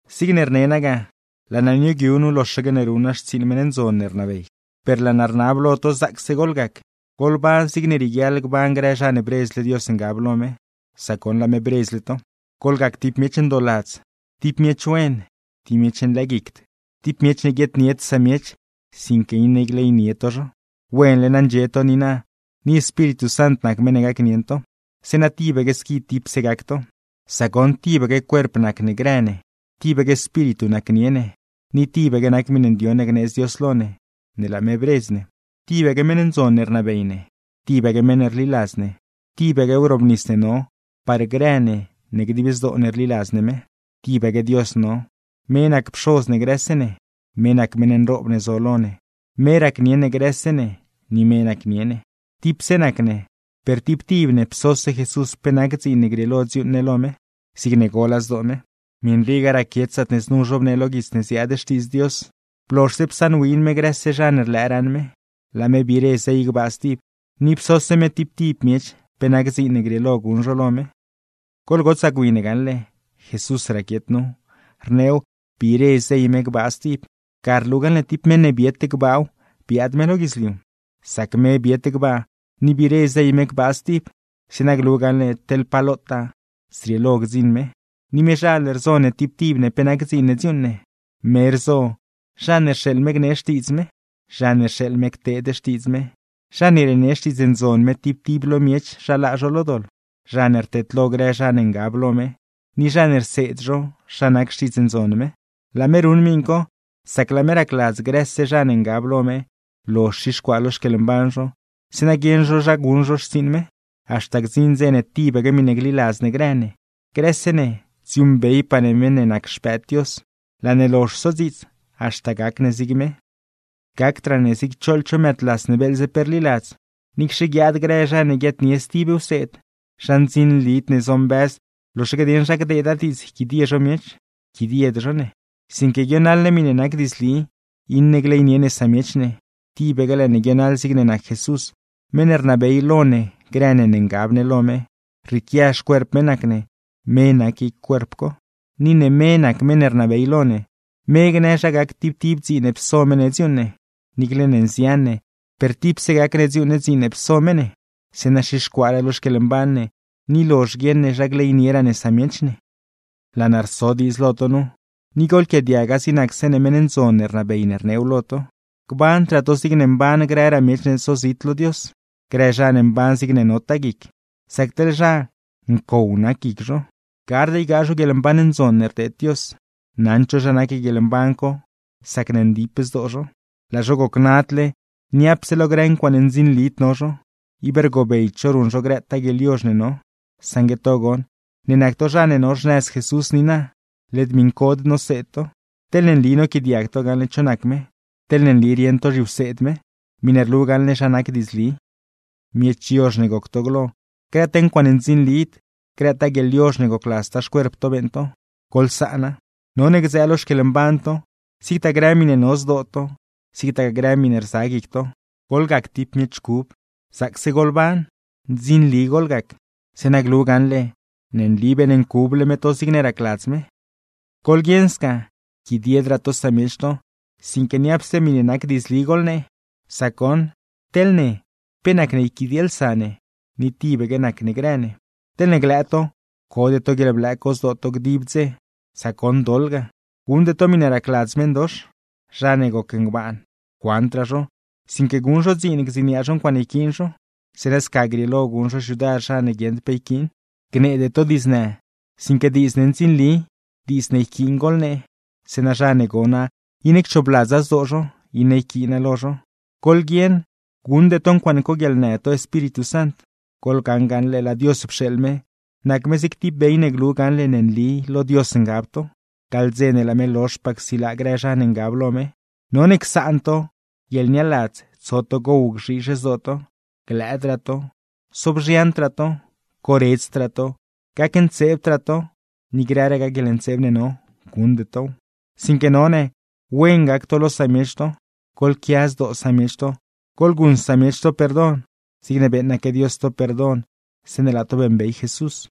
Zigne rne naa ga, laa naa nioogyu nu loxaque ne ruṉ naa xtsiiṉ meṉ ndzon ne rnabey, per laa naa rnab lo to zaacse goḻgac, goḻban zigne rieguiaḻ gban grë zha ne bredzle Dios ngab lo me, sac goṉ laa me bredzle to. Goḻgac tib miech ndooladz, tib miech wen, tib miech nlëëguicd, tib miech ne guieednied samiech sinque iṉe gleynie to zho. Wenle na ndxie to niina, ni Espíritu Sant nac meṉ ne gacnieṉ to; zeeṉa tibaque squi tipse gac to. Sac goṉ tibaque cuerp nac ne grë ne, tibaque Espíritu nacnie ne, ni tibaque nac miṉe ndioṉ ne gneedz Dios lo ne, ne laa me bredz ne. Tibaque meṉ ndzon ne rnabey ne, tibaque meṉ ne rliladz ne, tibaque wrobnis ne no par grë ne ne dib zdoo ne rliladz ne me; tibaque Dios no, me nac Pxoz ne grëse ne, me nac meṉ nroob ne zo lo ne, me racnieṉ ne grëse ne, ni me nacnie ne. Tipse nac ne, per tib tib ne psose Jesús ne pe nac dziin ne grieelo dziuuṉ ne lo me, zigne gola zdoo me. Miṉ rii ga raquiet zaatne znu zhobnee lo guits ne ziaad Xtiidz Dios: Blozhse psaṉwin me grëse zha ne rlëë raṉ me, laa me biire zey gbaa stib; ni psose me tib tib miech pe nac dziin ne grieelo guṉ zho lo me. Goḻgotsaa gwi ne gaṉle, Jesús raquiet nu, rneew “biire zey me gbaa stib”, ga rlu gaṉle tib meṉ ne biet gbaaw biaad me lo guidzliu. Sac me biet gbaa, ni biire zey me gbaa stib, zeeṉa glu gaṉle teḻ pa lotaa zrieelo gdziṉ me. Ni mezhal rzo ne tib tib ne pe nac dziin ne dziuuṉ ne; me rzo: zha ne rxeeḻ me gnee xtiidz me, zha ne rxeeḻ me cteed xtiidz me, zha ne rienee Xtiidz Ndzon me tib tib lo miech zha laa zho lo doḻ, zha ne rteedlo grë zha ne ngab lo me, ni zha ne rseed zho zha nac Xtiidz Ndzon me. Laa me ruṉ miṉ co, sac laa me racladz grëse zha ne ngab lo me lozh xixcuaa lo xquieḻmban zho, zeeṉa guieṉ zho zha guṉ zho xtsiiṉ me; haxta gdziṉ dze ne tibaque miṉe gliladz ne grë ne, grëse ne dziuuṉbeypaa ne meṉ ne nac Xpëëd Dios. Laa ne lozh sodziits, haxta gac ne zig me. Gacdraa ne zig choḻ cho mëëdlas ne beeḻze pe rliladz; niicxe guiaad grë zha ne guiaadnie stib wseed, zha ndzinlid ne zombëz loxaque dieṉ zha gdeeda diidz yquidie zho miech; yquidied zho ne. Sinque guionaḻ ne miṉe nac diidzli, iṉe gleynie ne samiech ne, tibaque laa ne guionaḻ zigne nac Jesús, meṉ ne rnabey lo ne grë ne ne ngab ne lo me (rrieequia xcuerp me nac ne, me nac guic cuerp co). Ni ne me nac meṉ ne rnabey lo ne, me rnabey zha gac tib tib dziin ne pso me ne dziuuṉ ne; niicle ne nzian ne, per tipse nac ne laa ne nodziuuṉ dziin ne pso me ne, zeeṉa xixcuaaraa lo xquieḻmban ne, ni lozh guieṉ ne zha gleynieraa ne samiech ne. Laa naa rso diidz lo to nu, ni goḻquiaadiaga zig nac zeeṉe meṉ ndzon ne rnabey ne rneew lo to: gbandraa to zigne mban grëraa miech ne zozit lo Dios, grë zha ne mban zigne notaa guic; sac teḻ zha, ncow nac guic zho. Gard ygaa zho guieḻmban ndzon ne rdeed Dios, naṉd zho zha nac guieḻmban co sacne ndip zdoo zho. Laa zho gocnadle, niapse lo grë ncuaaṉe ndzinlid no zho, ib rgobeyd zho ruṉ zho grëtaa guieḻyozh ne no. Saṉgue to goṉ, ne nac to zha ne no xnëz Jesús niina, led miṉcod noseed to; teḻne nli noquiaadiag to gaṉle cho nac me, teḻne nli rieṉ to zhiwseed me miṉe rlu gaṉle zha nac diidzli. Miech yozh ne goc to glo, grëtaa ncuaaṉe ndzinlid, grëtaa guieḻyozh ne gocladztaa xcuerp to beeṉ to, ¡goḻsaana! None gdzëë lo xquieḻmban to, zigtaa grë miṉe no zdoo to, zigtagaa grë miṉe rza guic to, goḻgac tib miech cub, zaacse goḻban, ndzinli goḻgac; zeeṉa glu gaṉle ne nli beeṉncuble me to zigne racladz me. Goḻguieṉ sca, yquidiedraa to samiech to, sinque niapse miṉe nac diidzli goḻnee, sac goṉ teḻ ne pe nacne yquidielsa ne ni tibaque nac ne grë ne. Teḻne glëë to, code to guieḻblëë co zdoo to dib dze, sac goṉ doḻ ga. Guṉde to miṉe racladz meṉdox. Zha ne goc ngbaan lëë, cuandraa zho, sinque guṉ zho dziin gdziniaa zho ncuaaṉe yquiin zho, zeeṉa scagaa grieelo guṉ zho xyudar zha ne guieṉd pe yquiin. Gneede to diidznë, sinque diidz ne ndzinli, diidz ne yquiin goḻnee, zeeṉa zha ne gona iṉe cchoobladza zdoo zho, iṉe yquiina lo zho. Goḻguieṉ, guṉde to ncuaaṉe coguieḻnë to Espíritu Sant. Goḻgaṉ gaṉle laa Dios pxeeḻ me, nac me zig tib bey ne glu gaṉle ne nli lo Dios ngab to, gaḻ dze ne laa me lozhpaa csilaa grë zha ne ngab lo me. None csaan to: guieḻnialadz, tso to gow gzhiizh zdoo to; glëëdraa to, sobzhiandraa to, coredzdraa to, gacntseebdraa to, ni grëragaa guieḻntseeb ne no, guṉde tow. Sinque none: wen gac to lo samiech to, goḻquia zdoo samiech to, goḻguṉ samiech to perdon, zigne beeṉaque Dios to perdon zeeṉe laa to beeṉbey Jesús.